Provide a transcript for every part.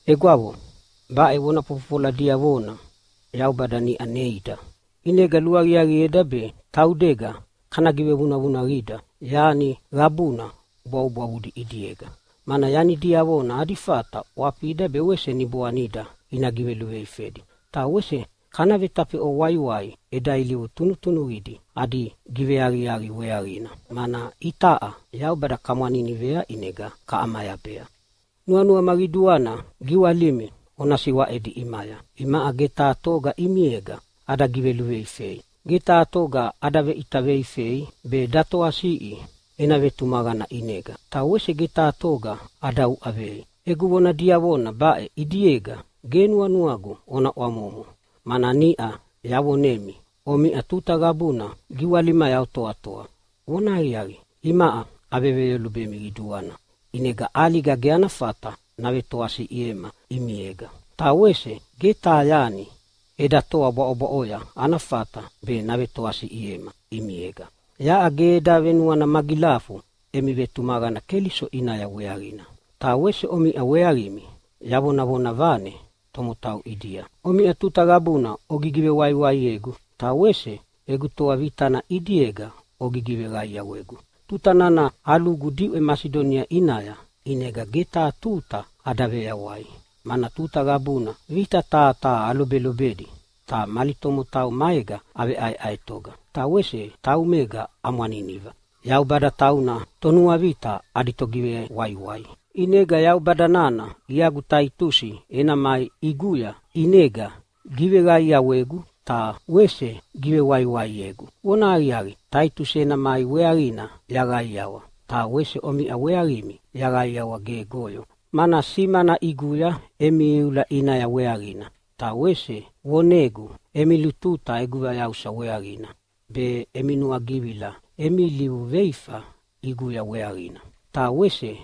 Egwavo, baʼe vona fofofola diavona Yaubada niʼa neida, ʼinega luaqiaqieda be taudega kana givevunavunaqida yani qabuna bwavubwavudi ʼidiega, mana yani diavona adi fata ʼwafida be wese niboanida ina giveluveifedi. Ta wese kana vetafeʼwa waiwai eda ilivu tunutunuqidi adi giveaqiaqi weaqina, mana itaʼa Yaubada kamwaninivea ʼinega kaʼamayabea. Nuanuama qiduana giwalimi ona siwaʼedi ʼimaya. Imaʼa ge taha toga ʼimiega ada giveluveifei. Ge taha toga ada veʼita veifei be datoasiʼi ena vetumaqana ʼinega, ta wese ge taha toga ada uʼavei. Egu vona diavona baʼe ʼidiega ge nuanuagu ona ʼwamomo, mana niʼa yavonemi omiʼa tuta qabuna giwalimaya otoatoa. Vonahaqiaqi, imaʼa aveveyolubemi qiduana, ʼinega ʼaliga ge ana fata navetoasiʼiema ʼimiega, ta wese ge taha yani eda toa bwaʼobwaʼoya ana fata be navetoasiʼiema ʼimiega. Yaʼa ge eda venuana magilafu emi vetumaqana Keliso ʼinaya weaqina, ta wese omiʼa weaqimi yavonavona vane tomotau ʼidia. Omiʼa tuta qabuna ogigivewaiwaiegu, ta wese egu toa vitana ʼidiega ogigiveqaiawegu. Tuta nana alugu diʼwe Masidonia ʼinaya, ʼinega ge taha tuta ada veyawai, mana tuta qabuna vita taha taha alobedi. Ta mali tomotau maega aveʼaeʼaetoga, ta wese taumega amwaniniva. Yaubada tauna tonuavita adi togivewaiwai. ʼInega Yaubada nana iagu Taitusi ena mai ʼiguya ʼinega giveqaiawegu ta wese givewaiwaiegu. Vonahaqiaqi, Taitusi ena mai weaqina yaqaiawa, ta wese omiʼa weaqimi yaqaiawa gegoyo, mana simana ʼiguya emi iula ʼinaya weaqina. Ta wese vonegu emi lututa egu vayausa weaqina be, emi nuagivila emi veilivu veifa ʼiguya weaqina, ta wese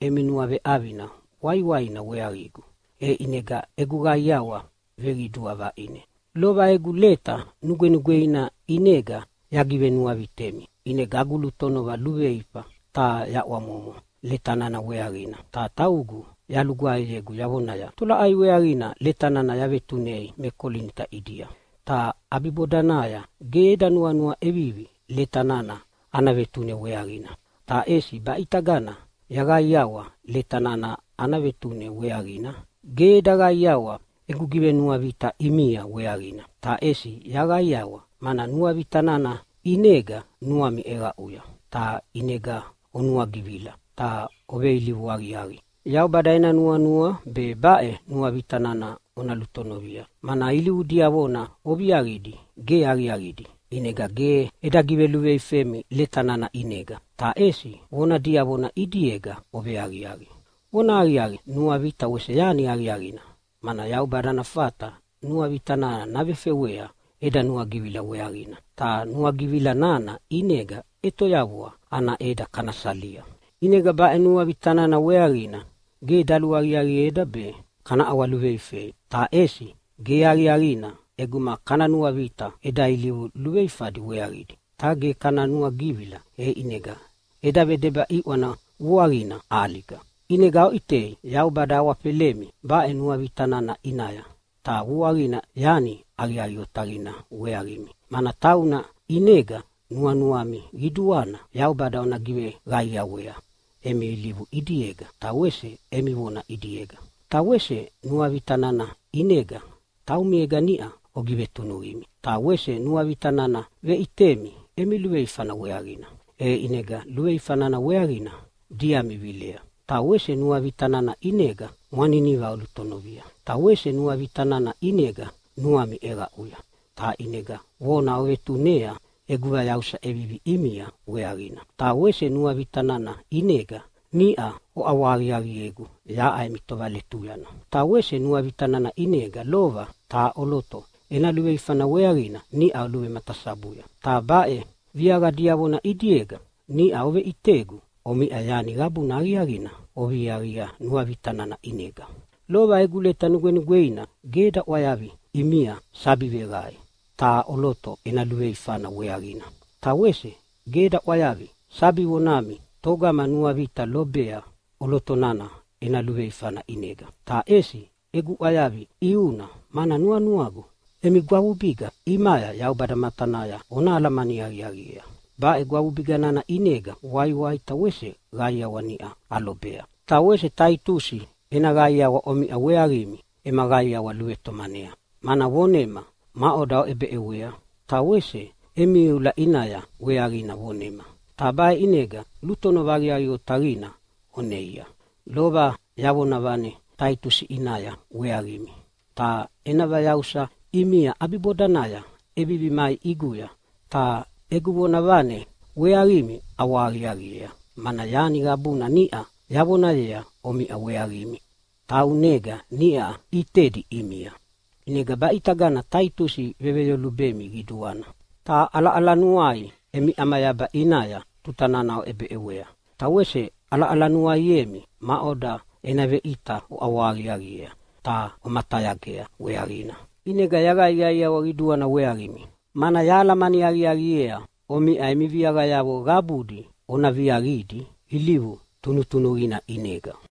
emi nuaveʼavina waiwaina weaqigu, e ʼinega egu qaiawa veqidua vaʼine. Lova egu leta nugwenugweina ʼinega yagivenuavitemi, ʼinega agu lutonova luveifa ta yaʼwamomo leta nana weaqina ta taugu yalugwaeyegu yavonaya, “Tolaʼai weaqina leta nana yavetunei me Kolinita ʼidia?” Ta ʼabibodanaya ge eda nuanua ʼevivi leta nana ana vetune weaqina. Ta ʼesi baʼitagana yaqaiqaiawa leta nana ana vetune weaqina. Ge eda qaiawa egu givenuavita ʼimia weaqina, ta ʼesi yaqaiqaiawa mana nuavita nana ʼinega nuami ʼeqaʼuya ta ʼinega onuagivila ta oveilivu aqiaqi. Yaubada ena nuanua be baʼe nuavita nana ona lutonovia, mana ilivu diavona oviaqidi ge aqiaqidi. ʼInega ge eda giveluveifemi leta nana ʼinega, ta ʼesi vona diavona ʼidiega oveaqiaqi. Vonahaqiaqi, nuavita wese yani aqiaqina, mana Yaubada ana fata nuavita nana navefewea eda nuagivila weaqina, ta nuagivila nana ʼinega ʼetoyavua ana ʼeda kana salia. ʼInega baʼe nuavita nana weaqina ge daluaqiaqieda be kana ʼawaluveifei. Ta ʼesi ge aqiaqina ʼeguma kana nuavita eda ilivu luveifadi weaqidi ta ge kana nuagivila, e ʼinega eda vedeba ʼiʼwana vuaqina ʼaliga. ʼInega oʼitei, Yaubada awafelemi baʼe nuavita nana ʼinaya, ta vuaqina yani aqiaqi otaqina weaqimi, mana tauna ʼinega nuanuami qiduana Yaubada ona giveqaiawea emi ilivu ʼidiega ta wese emi vona ʼidiega. Ta wese nuavita nana ʼinega taumiega niʼa ogivetunuqimi. Ta wese nuavita nana veʼitemi emi luveifana weaqina, e ʼinega luveifa nana weaqina diami vilea. Ta wese nuavita nana ʼinega mwaniniva olutonovia. Ta wese nuavita nana ʼinega nuami ʼeqaʼuya ta ʼinega vona ovetunea egu vayausa ʼevivi ʼimia weaqina. Ta wese nuavita nana ʼinega niʼa oʼawahaqiaqiegu yaʼa emi tovaletuyana. Ta wese nuavita nana ʼinega lova taha ʼoloto ena luveifana weaqina niʼa oluvematasabuya. Ta baʼe viaqa diavona ʼidiega niʼa oveʼitegu omiʼa yani qabuna aqiaqina oviaqia nuavita nana ʼinega. Lova egu leta nugwenugweina ge eda ʼwayavia ʼimia sabi veqae taha ʼoloto ena luveifana weaqina, ta wese ge eda ʼwayavia sabi vonami togama nuavita lobea ʼoloto nana ena luveifana ʼinega, ta ʼesi egu ʼwayavi ʼiuna mana nuanuagu emi gwavubiga ʼimaya Yaubada matanaya ona alamani aqiaqiea. Baʼe gwavubiga nana ʼinega waiwai ta wese qaiawa niʼa alobea. Ta wese Taitusi ena qaiawa omiʼa weaqimi ema qaiawa luvetomanea, mana vonema maʼoda oʼebeʼewea ta wese emi iula ʼinaya weaqina vonema. Ta baʼe ʼinega lutonova aqiaqi otaqina oneia. Lova yavonavane Taitusi ʼinaya weaqimi. Ta ena vayausa ʼimia ʼabibodanaya ʼevivi mai ʼiguya ta egu vonavane weaqimi ʼawahaqiaqiea, mana yani qabuna niʼa yavonayea omiʼa weaqimi taunega niʼa ʼitedi ʼimia. ʼInega baʼitagana Taitusi veveyolubemi qiduana, ta ʼalaʼalanuai emi ʼamayaba ʼinaya tuta nana oʼebeʼewa. Ta wese ʼalaʼalanuaiemi maʼoda ena veʼita oʼawahaqiaqiea ta omatayagea weaqina. ʼInega yaqaiqaiawa qiduana weaqimi, mana yahalamani aqiaqiea omiʼa emi viaqayavo qabudi ona viaqidi ilivu tunutunuqina ʼinega.